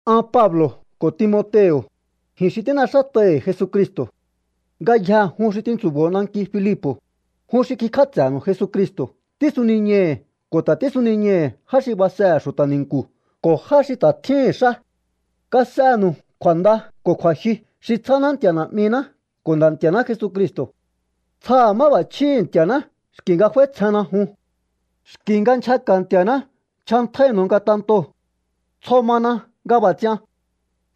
An Pablo̱ ko̱ Timoteo̱, ji̱n xi tín'exát'ai̱hi̱ Jesucristo̱. Ngayjee̱ jun xi tintsu̱bo̱o nanki Filipo̱, jun xi kikj'áts'e̱nu̱u Jesucristo̱ tísuniñai̱hi̱ ko̱ ta̱ tísuniñai̱hi̱ já xi basehe̱ xu̱ta̱ ni̱nku̱ ko̱ já xi ta̱ tjíhi̱n xá. Kas'enu̱u kju̱a̱nda ko̱ kju̱a̱jyu xi tsjáná Nti̱a̱ Na̱'miná ko̱ Nda̱ Nti̱a̱ná Jesucristo̱. Tsjaha̱ máb'a̱chjíhi̱ Nti̱a̱ná xki̱ nga f'áítsjenna jun. Xki nga nchjaka̱ Nti̱a̱ná nchjantjáínu̱u ngatentoo̱. Tsjo mana nga b'a̱ ts'ian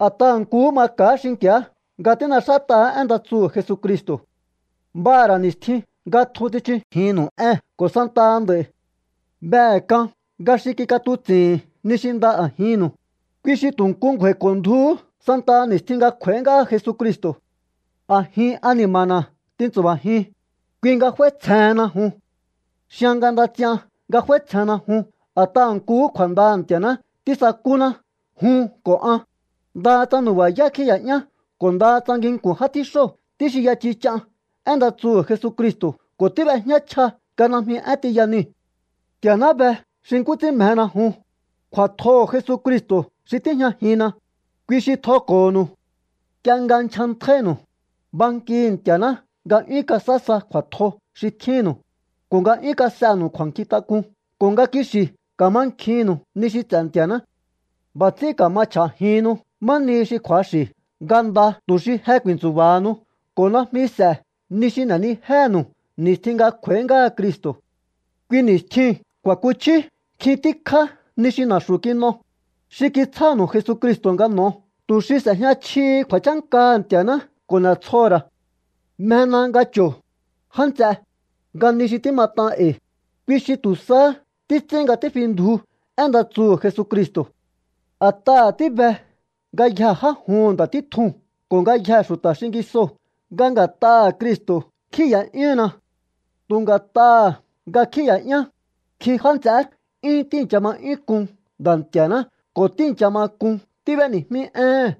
a̱t'aha̱ nkuhú maka̱á xinki̱á nga tín'exát'aha̱á én nda tsuhu̱ Jesucristo̱. B'aha̱ ra̱ ni̱stjin nga tjun tsichujinnu̱u ée̱n ko̱ santaha nd'a̱i̱. Behe̱ k'an nga xi kik'atuts'i̱hi̱n ni xi nda a̱jinnu̱u, kui xi tu̱ nku ngju̱a̱i̱ko̱ndjuhú santaha ni̱stjin nga kj'u̱a̱í ngáha Jesucristo̱. A̱jin ani̱ma̱na̱ tintsu̱ba̱jiun, kui nga f'áítsjehenna jun. Xian nga nda ts'ian nga f'áítsjenna jun a̱t'aha̱ nkuhú kju̱a̱ndaha̱ Nti̱a̱ná tísakúná jun ko̱ an, ndaha tsa nu̱ba̱yá kjíi̱ya'yán ko̱ ndaha tsa nginku̱n já tjíxóo̱ tíxinya chich'an én nda tsuhu̱ Jesucristo̱ ko̱ tíb'ejñá chja nga najmi én tiya niu̱. Nti̱a̱ná be xi nkú ts'ín mjena jun. Kju̱a̱tjoho̱ Jesucristo̱ xi tíjñajinna, kui xi tjoko̱ho̱nu̱u. Nk'ie nga nchjantjáínu̱u, bankihi̱ Nti̱a̱ná nga 'yún kasaá sa kju̱a̱tjo xi tjínnu̱u, ko̱ nga 'yún kas'enu̱u kju̱a̱nkjintak'un, ko̱ nga kixi̱ ka̱mankjinnu̱u ni xi ts'e̱ Nti̱a̱ná. B'a̱ ts'ín ka̱ma chj'a̱jihinnu má nihi xi kju̱axi̱ nga nda tu̱ xi je ku̱i̱ntsu̱ba̱hanu ko̱ najmi s'e̱ ni xi n'e̱nijéhe̱nu̱u ni̱stjin nga kj'u̱a̱í ngáha Cristo̱. Kui ni̱stjiu̱n ku̱a̱kuchjíú nkjin tíkjá ni xi na̱xu̱ kin'o, xi kitsjánu̱u Jesucristo̱ nga n'o̱o tu̱ xi s'e̱jña chjihi kju̱a̱chánkaha̱ Nti̱a̱ná ko̱ n'e̱tsjoho̱ ra̱. Mjena nga cho̱o, já nts'e, nga ni xi tímat'an e̱i̱, kui xi tu̱ sahá títs'ín nga tífindju én nda tsuhu̱ Jesucristo̱. A̱t'aha̱ tíbe ngayjee̱ já juhu̱n nda̱ títjuu̱n ko̱ ngayjee̱ xu̱ta̱ xingisoo̱ nga nga̱t'aha̱ Cristo̱ kjíi̱ya'yúhunna. Tu̱ nga̱t'aha̱ nga kjíi̱ya'yán, nkjin já nts'eé 'yún tíi̱ncha ma 'yún k'un Nda̱ Nti̱a̱ná ko̱ tíi̱ncha ma k'un tíb'éni̱jmí éhe̱n.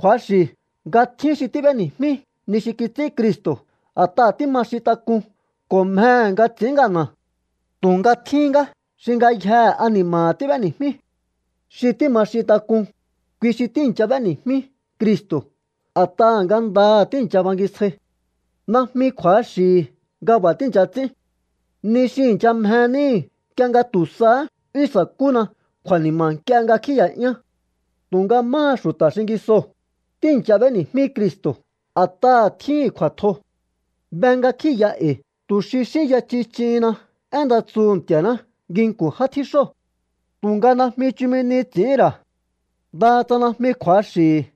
Kju̱axi̱ nga tjín xi tíb'éni̱jmí ni xi kits'ín Cristo̱ a̱t'aha̱ tíma xintak'un ko̱ mjehe̱ nga ts'i̱ín ngana̱. Tu̱nga tjíhín ngá xi ngayjehe ani̱ma̱ha̱ tíb'éni̱jmí. Xi tíma xintak'un, kui xi tíi̱ncha b'éni̱jmí Cristo̱ a̱t'aha̱ ngandaha̱ tíi̱ncha bangisjai. Najmi kju̱axi̱hi̱ nga b'a̱ tíi̱ncha ts'ín. Ni xi i̱ncha mje níhi̱ nk'ie nga tu̱ sahá 'yún sa̱kúna kju̱a̱ni̱ma̱ nk'ie nga kjíi̱ya'yán. Tu̱nga máha xu̱ta̱ xingisoo̱, tíi̱ncha b'éni̱jmí Cristo̱ a̱t'aha̱ tjíhi̱n ku̱a̱tjo. Be nga kjíi̱ya e̱i̱ tu̱ xi xínya chich'ihinna én nda tsuhu̱ Nti̱a̱ná nginku̱n já tjíxóo̱. Tu̱nga najmi chumi ni ts'i̱hín ra̱. Ndaha tsa najmi kju̱axi̱hi̱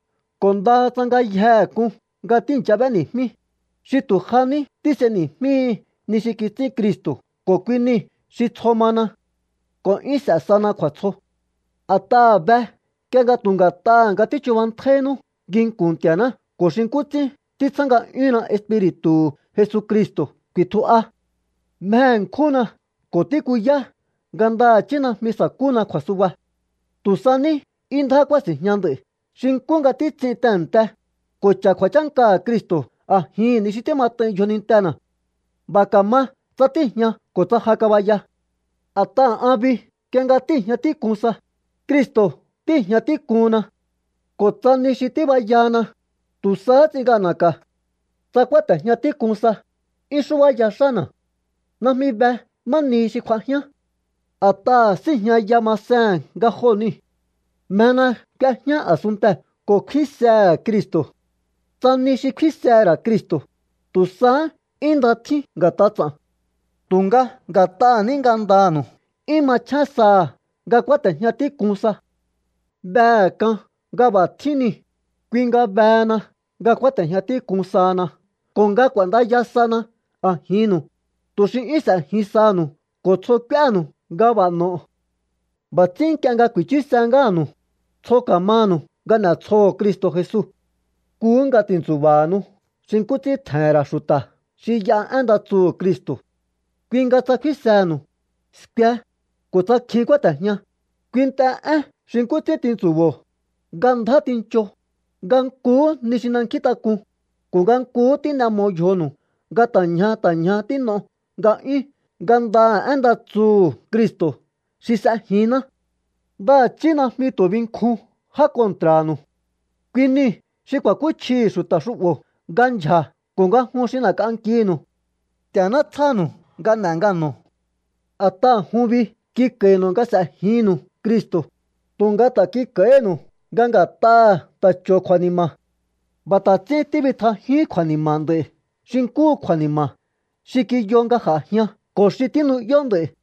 ko̱ ndaha tsa ngayjehe k'un nga tíi̱ncha b'éni̱jmí, xi tu̱ ja ní tís'eni̱jmíhi ni xi kits'ín Cristo̱ ko̱ kui niu̱ xi tsjo mana. Ko̱ 'yún s'e̱ sana kju̱a̱tsjo. A̱t'aha̱ be nk'ie nga tu̱ nga̱t'aha̱ nga tíchubantjáínú nginku̱n Nti̱a̱ná ko̱ xi nkú ts'ín títsjá nga'yúnna Espiri̱tu̱hu̱ Jesucristo̱ ku̱i̱tju'a. Mje ṉkjúnna ko̱ tíkuyá nga ndaha̱chí najmi sa̱kúna kju̱a̱suba. Tu̱ sa ní 'yún ndjá kúási̱njña nd'a̱i̱ xi nkú nga títs'in tehe̱nte, ko̱ cha̱ kju̱a̱chánkaha̱ Cristo̱ a̱jihi̱n ni xi tímat'ain yjonintena̱. B'a̱ ka̱ma tsa tíi̱jña ko̱ tsa ja kabaya. A̱t'aha̱ an bi nk'ie nga tíi̱jña tík'un sa, Cristo̱ tíi̱jña tík'uhunna. Ko̱ tsa ni xi tíbayahana, tu̱ sahá ts'in ngana̱ka̱. Tsa kúáte̱jña tík'un sa, 'yún xúbáya xána̱. Najmi be má nihi xi kj'uajián. A̱t'aha̱ síi̱jñaya masehe̱n nga joo̱ niu̱. Mjena k'uejñá a̱sunntee̱ ko̱ kfínsehe̱ Cristo̱. Tsa ni xi kfínsehe̱ ra̱ Cristo̱, tu̱ sahá 'yún nda tjín nga̱t'a ts'a̱n. Tu̱nga nga̱t'aha̱ ní ngandanu̱u 'yún machjén saha̱ nga kúáte̱jña tík'un sa. Behe̱ k'an nga b'a̱ tjín niu̱, kui nga behena nga kúáte̱jña tík'un sahana ko̱ nga k'u̱a̱ndaya sana a̱jinnu̱u, tu̱ xi 'yún s'e̱jin saha̱nu̱u ko̱ tsjo k'úénu̱u nga b'a̱ n'o̱o. B'a̱ ts'ín nk'ie nga ku̱i̱chuse ngáha̱nu̱u, tsjo ka̱manu̱u nga n'e̱tsjoho̱o Cristo̱ Jesu. Nkuhú nga ti̱ntsu̱ba̱hanu xi nkú ts'ín tje̱he̱n ra̱ xu̱ta̱ xi y'a én nda tsuhu̱ Cristo̱. Kui nga tsa kfínsenu̱u, skue, ko̱ tsa kjin kúáte̱jña, kuint'e én xi nkú ts'ín tintsu̱bo̱o, nga ndjá tincho, nga nkuhú ni xi n'e̱nkjíntak'un, ko̱ nga nkuhú tín'e mo yjonu̱u nga ta̱ ñja ta̱ ñja tín'o̱o nga'yún ngandaha̱ én nda tsuhu̱ Cristo̱ xi s'ejinná. Ndaha̱chí najmi tu̱ binkjun já kontra̱nu̱u. Kui niu̱ xi ku̱a̱kúchjihi̱ xu̱ta̱ xu'bo̱ nga ndyja̱ ko̱ nga jun xi n'e̱k'ankinu̱u. Nti̱a̱ná tsjánu̱u nga n'e̱ ngano̱o. A̱t'aha̱ jun bi kik'a̱i̱nu̱u nga s'e̱jinnu̱u Cristo̱, tu̱nga ta̱ kik'a̱i̱hínu̱u nga nga̱t'aha̱ ta̱ cho̱o kju̱a̱ni̱ma̱. B'a̱ ta̱ ts'ín tíbitjajíún kju̱a̱ni̱ma̱ nd'a̱i̱ xi nkúhu kju̱a̱ni̱ma̱ xi kiyo nga j'a̱jian ko̱ xi tínu'yó nd'a̱i̱.